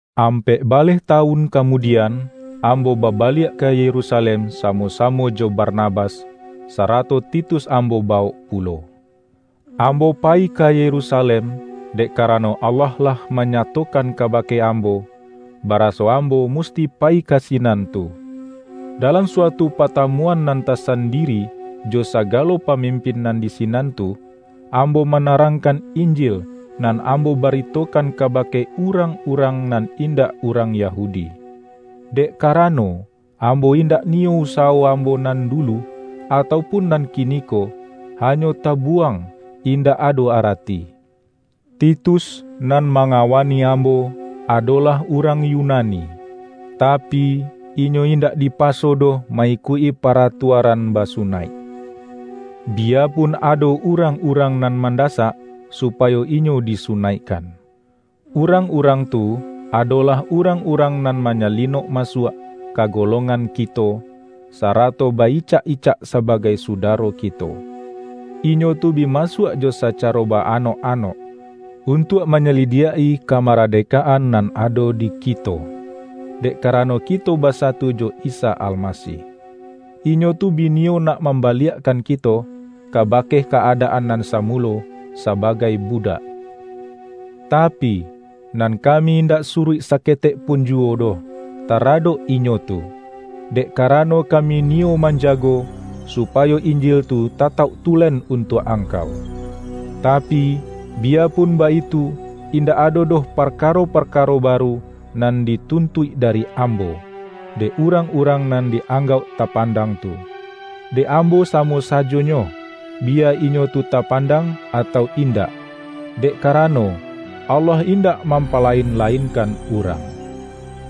Ampek baleh tawun kamudian, ambo babaliak ka Yerusalem samo-samo jo Barnabas, sarato Titus am-bo bawok pulo. Ambo payi ka Yerusa-lem, dek karano Allah lah manyatokan kabake ambo, baraso ambo musti pa-yi ka sinan tu. Dalam suatu patamuan nan tasandiri jo sagalo pamimpin nan di sinan tu, ambo manarangkan Injil nan ambo baritokan kabake urang-urang nan indak urang Yahudi. Dek karano, ambo indak niyo usawo ambo nan dulu, atau pun nan kiniko, hanyo tabuwang indak ado arati. Titus, nan mangawani ambo, adolah urang Yu-nani, tapi, inyo indak dipaso doh ma-ikuik-i paratuaran basunaik, biyapun ado urang-urang nan mandasak, su-payo inyo disunaikkan. Urang-urang tu, adolah urang-urang nan manyali-nok masuak ka golongan kito, sarato ba-icak-icak sabagai sudaro kito. Inyo tu bi masuak jo sacaro ba-anok-anok, untuak manyalidiak-i kamaradekaan nan ado di kito, dek karano kito basa-tu jo Isa Almasih. Inyo tu bi niyo nak mambaliakkan kito, kabake ka-adaan nan samulo sabagai budak, tapi, nan kami indak suruik saketek pun juwo doh taradok inyo tu, dek karano ka-mi niyo manjago, supayo Injil tu ta-tauk tulen untuak angkau. Tapi, biyapun baitu, indak ado doh parkaro-parkaro baru nan dituntuik dari ambo, dek urang-urang nan di-anggauk tapandang tu — dek ambo samo sajonyo, biya inyo tu tapandang atau indak, dek karano, Allah indak mampalain-lain-kan urang.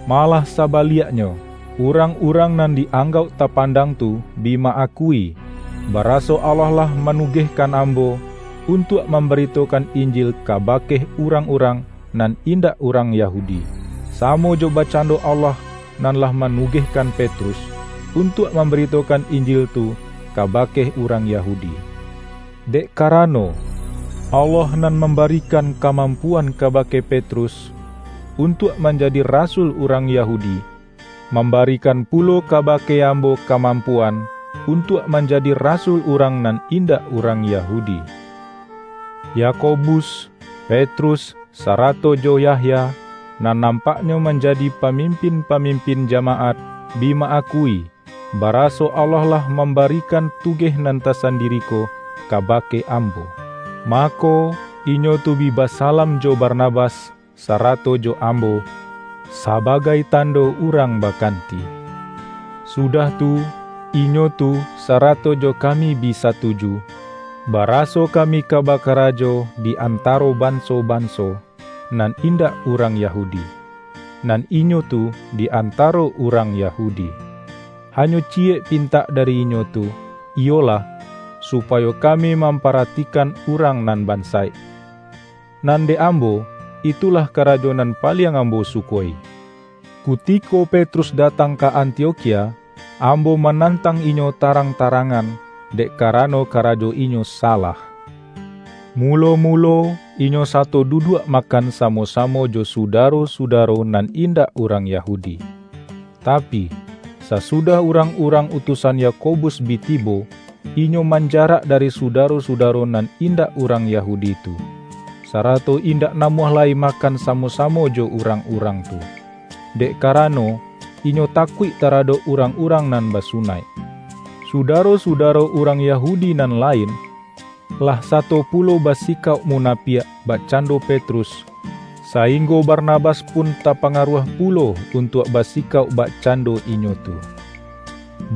Malah sabaliaknyo, urang-urang nan di-anggauk tapandang tu bi ma-akui, baraso Allah lah manugehkan ambo, untuak mambaritokan Injil kaba-ke urang-urang nan indak urang Yahu-di, samo jo bakcando Allah nan lah ma-nugehkan Petrus, untuak mambaritokan Injil tu kabake urang Yahudi. Dek ka-rano, Allah nan mambarikan kamampu-an kabake Petrus, untuak manjadi rasul urang Yahudi, mambarikan pulo kabake ambo kamampuan, untuak manja-di rasul urang nan indak urang Yahudi. Yakobus, Petrus, sarato jo Yahya, nan nampaknyo manjadi pamimpin-pamim-pin jamaat, bi ma-akui, baraso Allah lah mambarikan tugeh nan tasandiri ko ka-bake ambo. Mako, inyo tu bi basalam jo Barnabas, sarato jo ambo, sabagai tan-do urang bakanti. Sudah tu, inyo tu sa-rato jo kami bi satuju, baraso kami ka bakarajo di antaro banso-banso nan in-dak urang Yahudi, nan inyo tu di antaro urang Yahudi. Hanyo ciyek pintak dari inyo tu, iyolah, supayo kami mamparati-kan urang nan bansaik. Nan dek ambo, itulah karajo nan paliang ambo suko-i. Kutiko Petrus datang ka Antiokhia, ambo manantang inyo tarang-tarang-an, dek karano karajo inyo salah. Mu-lo-mulo, inyo sato duduak makan samo-samo jo sudaro-sudaro nan indak urang Yahudi. Tapi, sasudah urang-urang utu-san Yakobus bi tibo, inyo manjarak da-ri sudaro-sudaro nan indak urang Ya-hudi tu, sarato indak namuah lai makan samo-samo jo urang-urang tu, dek kara-no, inyo takuik taradok urang-urang nan basunaik. Sudaro-sudaro urang Yahu-di nan lain, lah sato pulo basikauk muna-piak bakcando Petrus, sainggo Barnabas pun tapangaruah pulo untuak basikauk bakcando inyo tu.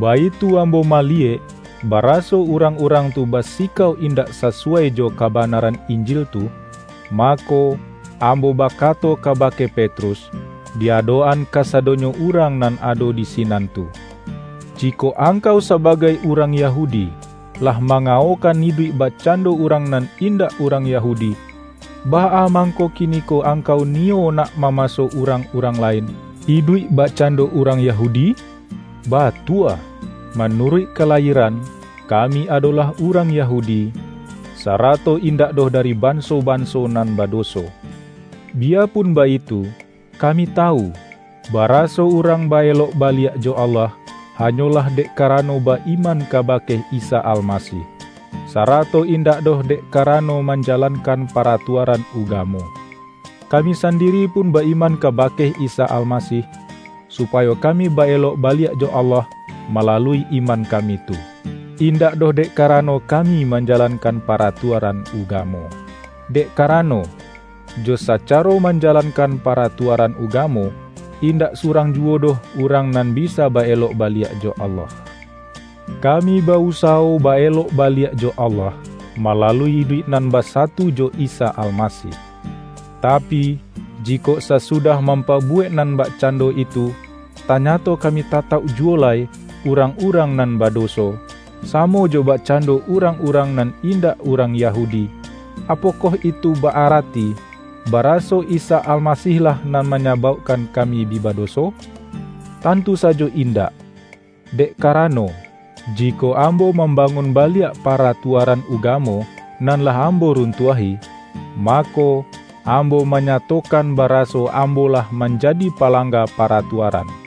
Baitu ambo mali-yek, baraso urang-urang tu basikauak indak sasuwai jo kabanaran Injil tu, ma-ko, ambo bakato kabake Petrus, di adok-an kasadonyo urang nan ado di sinan tu,”Jikok angkau sabagai urang Yahudi, lah mangawokan iduik bakcando urang nan indak urang Yahudi, baa mangko kiniko angkau niyo nak mamaso urang-urang lain, iduik bakcando urang Yahudi?” Batua, manuruik kalayieran, kami adolah urang Yahudi, sarato indak doh dari”banso-banso nan badoso” Bi-yapun baitu, kami tawu, baraso urang ba-elok baliak jo Allah, hanyolah dek karano ba-iman kabake Isa Almasih, sarato indak doh dek karano manja-lankan paratuaran ugamo. Kami san-diri pun ba-iman kabake Isa Almasih, supayo kami ba-elok baliak jo Allah malalui iman kami tu, indak doh dek karano kami manjalankan paratuaran ugamo. Dek karano, jo sacaro manja-lankan paratuaran ugamo, indak su-rang juwo doh urang nan bisa ba-elok baliak jo Allah. Kami ba-usawo ba-elok baliak jo Allah, malalui iduik nan basatu jo Isa Almasih. Tapi, jikok sasu-dah mampabuwek nan bakcando itu, tanyato kami tatauk juwo lai,”urang-urang nan badoso”, samo jo bakcan-do urang-urang nan indak urang Ya-hudi, apokoh itu ba-arati, baraso Isa Almasih-lah nan manyabaukkan kami bi badoso? Tantu sajo indak! Dek ka-rano, jikok ambo mambangun baliak paratuaran ugamo nan lah ambo run-tuahi, mako, ambo manyatokan bara-so ambo lah manjadi palangga para-tuaran.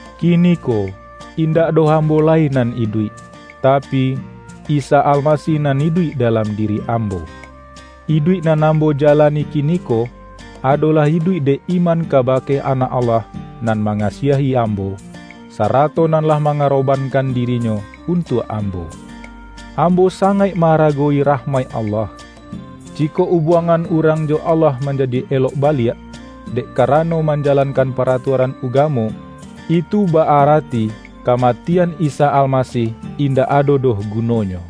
Kiniko, indak doh ambo lai nan iduik, tapi, Isa Almasih nan iduik da-lam diri ambo. Iduik nan ambo jalani kiniko, adolah iduik dek iman kabake Anak Allah nan mangasiahi ambo, sa-rato nan lah mangarobankan diri-Nyo untuak ambo. Ambo sangaik ma-ara-gowi rahmaik Allah. Jikok ubuangan urang jo Allah manjadi elok baliak, dek karano manjalankan paratua-ran ugamo, itu ba-arati kamatian Isa Almasih indak ado doh gunonyo!